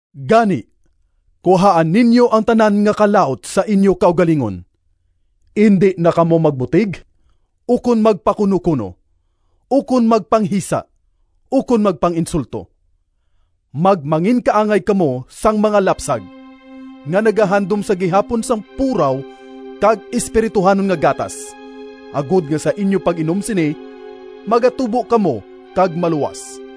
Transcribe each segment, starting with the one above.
Gani, kuhaa ninyo ang tanan nga kalaut sa inyo kaugalingon. Indi na kamo magbutig, ukon magpakunokuno, ukon magpanghisa, ukon magpang-insulto! Magmanginkaangay kamo sang mga lapsag, nga nagahandom sa gihapon sang puraw kag espirituhanon nga gatas, agod nga sa inyo pag-inom sini magatubo kamo kag maluwas.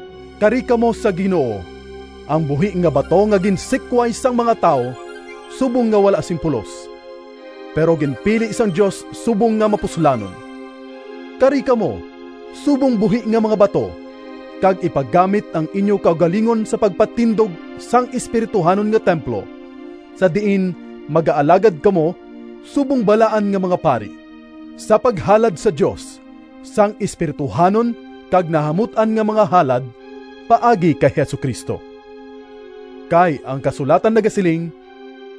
Kari kamo sa Ginoo, ang buhi nga bato nga ginsikway sang mga tawo subong nga wala sing pulos, pero ginpili sang Dios subong nga mapuslanon. Kari kamo subong buhi nga mga bato, kag ipagamit ang inyo kaugalingon sa pagpatindog sang espirituhanon nga templo, sa diin magaalagad kamo subong balaan nga mga pari, sa paghalad sa Dios sang espirituhanon kag nahamut-an nga mga halad paagi kay Jesu-Cristo. Kay ang kasulatan nagasiling: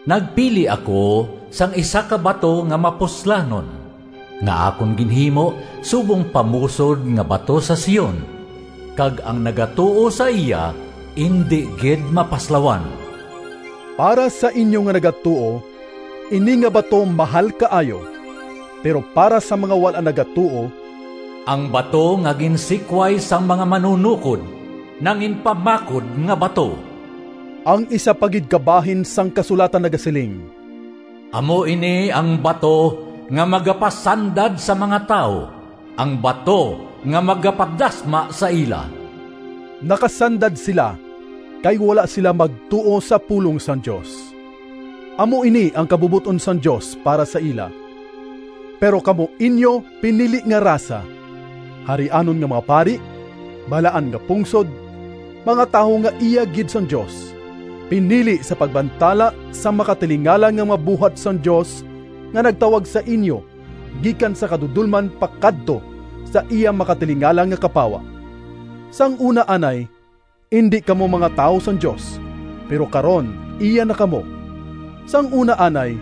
“Nagpili ako sang isa ka bato Nga mapuslanon, Nga akon ginhimo Subong pamusod nga bato sa Sion, Kag ang nagatuo sa iya Indi gid mapaslawan.” Para sa inyo nga nagatuo, ini nga bato mahal kaayo. Pero para sa mga wala nagatuo: “Ang bato Nga ginsikway sang mga manunokod Nanginpamakod nga bato.” Ang isa pa gid ka bahin sang kasulatan nagasiling: “Amo ini ang bato Nga magapasandad sa mga tawo, Ang bato nga magapadasma sa ila.” Nakasandad sila kay wala sila magtuo sa pulong sang Dios. Amo ini ang kabubot-on sang Dios para sa ila. Pero kamo inyo pinili nga rasa, harianon nga mga pari, balaan nga pungsod, mga tawo nga iya gid sang Dios, pinili sa pagbantala sang makatilingala nga mga buhat sang Dios, nga nagtawag sa inyo gikan sa kadudolman pakadto sa iya makatilingala nga kapawa. Sang una anay indi kamo mga tawo sang Dios, pero karon iya na kamo. Sang una anay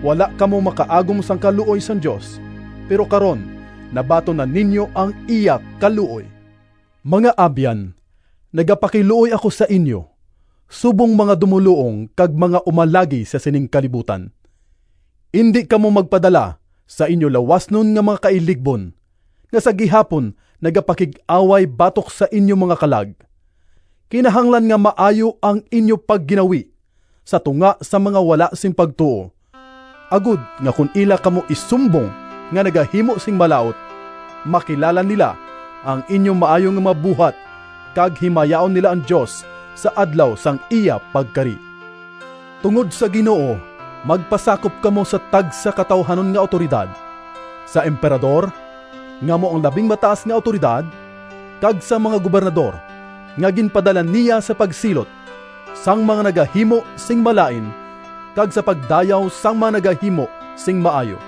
wala kamo makaagom sang kaluoy sang Dios, pero karon nabaton na ninyo ang iya kaluoy. Mga abyan, nagapakiluoy ako sa inyo, subong mga dumoluong kag mga umalagi sa sining kalibutan! Indi kamo magpadala sa inyo lawasnon nga mga kailigbon, nga sa gihapon nagapakig-away batok sa inyo mga kalag. Kinahanglan nga maayo ang inyo pagginawi sa tunga sang mga wala sing pagtuo, agod nga kon ila kamo isumbong nga nagahimo sing malaut, makilala nila ang inyo maayo nga mga buhat, kag himayaon nila ang Dios sa Adlaw sang iya pagkari. Tungod sa Ginoo magpasakop kamo sa tagsa ka tawuhanon nga awtoridad: sa Emperador, nga amo ang labing mataas nga awtoridad, kag sa mga gobernador nga ginpadala niya sa pagsilot sang mga nagahimo sing malain kag sa pagdayaw sang mga nagahimo sing maayo.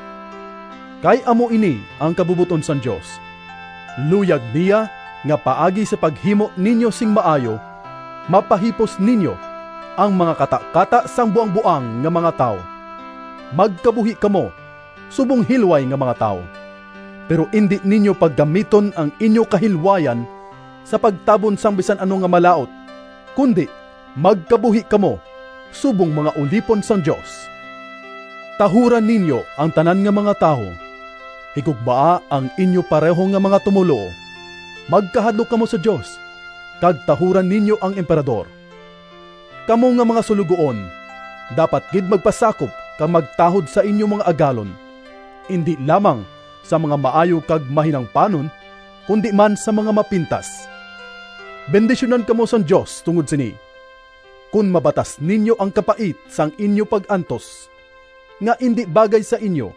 Kay amo ini ang kabubot-on sang Dios: luyag niya nga paagi sa paghimo ninyo sing maayo, mapahipos ninyo ang mga katakata sang buangboang nga mga tawo. Magkabuhi kamo subong hilway nga mga tawo. Pero indi ninyo paggamiton ang inyo kahilwayan, sa pagtabon sang bisan ano nga malaut, kundi magkabuhi kamo subong mga ulipon sang Dios. Tahura ninyo ang tanan nga mga tawo, higugmaa ang inyo pareho nga mga tumoluo, magkahadlok kamo sa Dios, kag tahura ninyo ang Emperador. Kamo nga mga suloguon dapat gid magpasakop kag magtahod sa inyo mga agalon, indi lamang sa mga maayo kag mahinangpanon, kundi man sa mga mapintas. Bendisyunan kamo sang Dios tungod sini, kon mabatas ninyo ang kapait sang inyo pag-antos nga indi bagay sa inyo,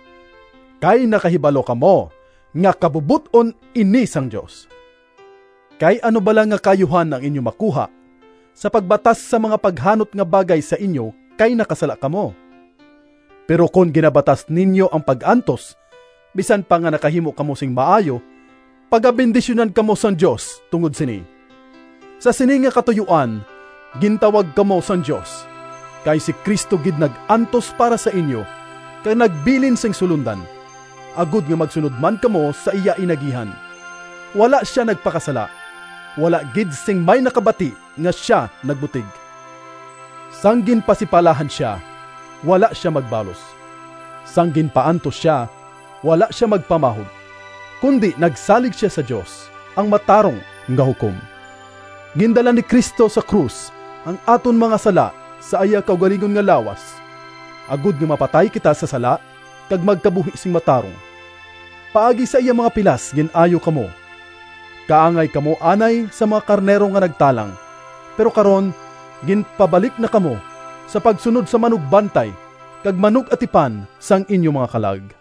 kay nakahibalo kamo nga kabubot-on ini sang Dios. Kay ano bala nga kaayuhan ang inyo makuha sa pagbatas sang mga paghanot nga bagay sa inyo kay nakasala kamo? Pero kon ginabatas ninyo ang pag-antos bisan pa nga nakahimo kamo sing maayo, pagabendisyunan kamo sang Dios tungod sini. Sa sini nga katuyoan gintawag kamo sang Dios, kay si Cristo gid nag-antos para sa inyo kag nagbilin sing sulondan, agod nga magsunod man kamo sa iya inagihan. Wala sia nagpakasala. Wala gid sing may nakabati nga sia nagbutig. Sang ginpasipalahan sia, wala sia magbalos; sang ginpaantos sia, wala sia magpamahog, kundi nagsalig sia sa Dios, ang matarong nga Hukom. Gindala ni Cristo sa krus ang aton mga sala sa iya kaugalingon nga lawas, agod nga mapatay kita sa sala kag magkabuhi sing matarong. Paagi sa iya mga pilas gin-ayo kamo. Kaangay kamo anay sa mga karnero nga nagtalang, pero karon ginpabalik na kamo sa pagsunod sa Manugbantay kag Manug-atipan sang inyo mga kalag.